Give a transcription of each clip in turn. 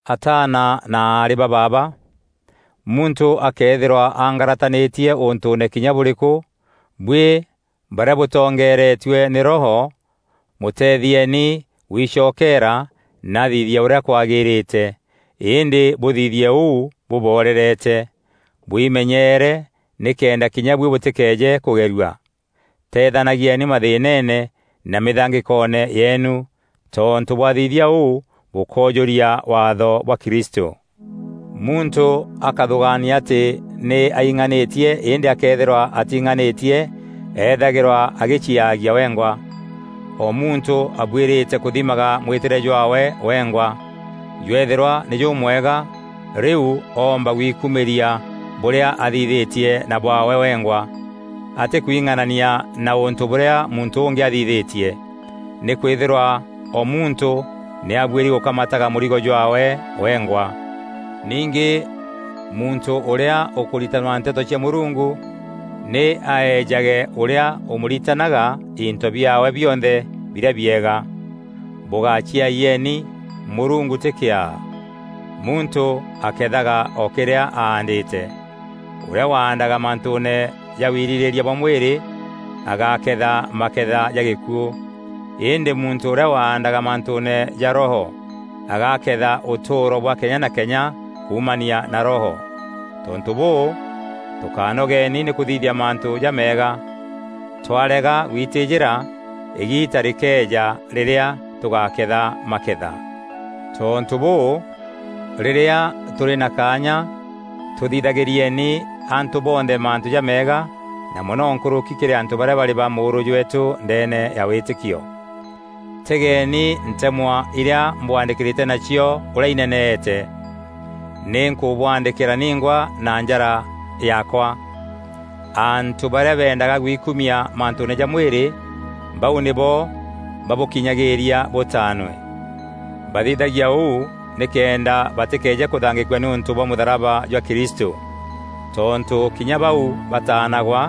Ataana na aarî ba baaba, muntû akëethîrwa angaratanîtie ûntûûne kinya bûrîkû, buî barîa bûtongeeretue nî Roho, mûteethieeni guicokeera na athithie ûrîa kwagîrîte; îndî bûthithie ûu, bûborerete. Bwimenyeere nîkenda kinya buî bûtîkeeje kûgerua. Tethanagieni mathîînene na mîthangîkoone yeenu, tontû bwathithia ûu bûkoojûria waatho bwa Kristû. Muntû akäthûgaania atî nî aing'anîtie îndî akëethîrwa ating'anîtie, ethagîrwa agîciaagia wengwa. O muntû abuîrîte kûthimaga mwîtîre jwaawe wengwa. Jwëethîrwa nî jûmwega, rîu oomba gwikumîria bûrîa athithîtie na bwaawe wengwa, atîkwing'anania na ûntû bûrîa muntû ûngî athithîtie. Nîkwîthîrwa o muntû nî abuîri gûkamataga mûrigo jwaawe wengwa. Ningî muntû ûrîa ûkûritanwa nteto cia Mûrungu nî aejage ûrîa ûmûritanaga into biaawe bionthe birîa biega. Bûgáciayieni; Mûrungu tî kîaa. Muntû akethaga o kîrîa aandîte. Ûrîa waandaga mantûûne ja wirîrîîria bwa mwîrî, agaketha maketha ja gîkuû, îndî muntû ûrîa waandaga mantûûne ja Roho agaketha ûtûûro bwa kenya na kenya kuumania na Roho. Tontû bûû, tûkánogeni nî kûthithia mantû jameega; twarega gwitîîjîra, îgiita rîkeeja rîrîa tûgaketha maketha. Tontû bûû, rîrîa tûrî na kaanya, tûthithagîrieni antû bonthe mantû jameega na mono nkûrûki kîrî antû barîa barî ba mûûrû jweetû ndeene ya wîtîkio. Tegeeni ntemwa irîa mbwaandîkîrîte nacio ûrîa ineneete. Nî nkûbwaandîkîra ningwa na njara yaakwa! Antû barîa bendaga gwikumia mantûûne ja mwîrî, bau nîbo babûkinyagîîria bûtaanwe. Bathithagia ûu nîkenda batîkeeje kûthangîkua nîûntû bwa mûtharaba jwa Kristû. Tontû kinya bau bataanagwa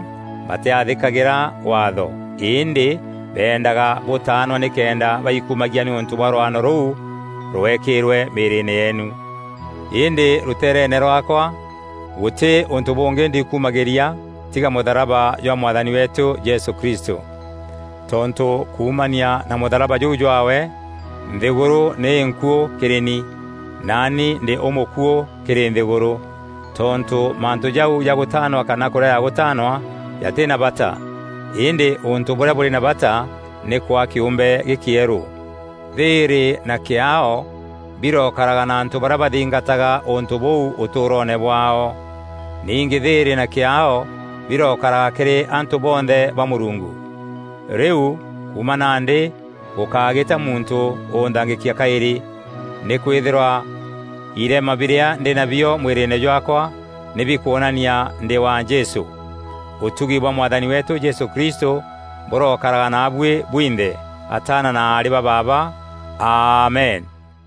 batîathîkagîra Waatho. Îndî bendaga bûtaanwa nîkenda baikumagia nîûntû bwa rwano rûu rwekîîrwe mîîrîîne yeenu. Îndî rûteereene rwaakwa, gûtî ûntû bûngî ndiikumagîria tiga mûtharaba jwa Mwathani weetû Jesû Kristû. Tontû kuumania na mûtharaba jûu jwaawe, nthîgûrû nî înkuû kîrî ni, naani ndî ûmûkuû kîrî nthîgûrû. Tontû mantû jau ja gûtaanwa kana kûrega gûtaanwa, jatî na bata; îndî ûntû bûrîa bûrî na bata nî kwaa kîûmbe gîkîerû. Thîîrî na kîaao birokaraga na antû barîa bathingataga ûntû bûu ûtûûroone bwaao. Ningî thîîrî na kîaao birokaraga kîrî antû bonthe ba Mûrungu! Rîu, kuuma nandî gûkágîta muntû ûnthangîkia kaîrî, nîkwîthîrwa irema birîa ndî nabio mwîrîîne jwaakwa nî bikwonania ndî wa Jesû. Ûtugi bwa Mwathani weetû Jesû Kristû bûrokaraga naabuî bwinthe, ataana na aarî ba baaba. Amen!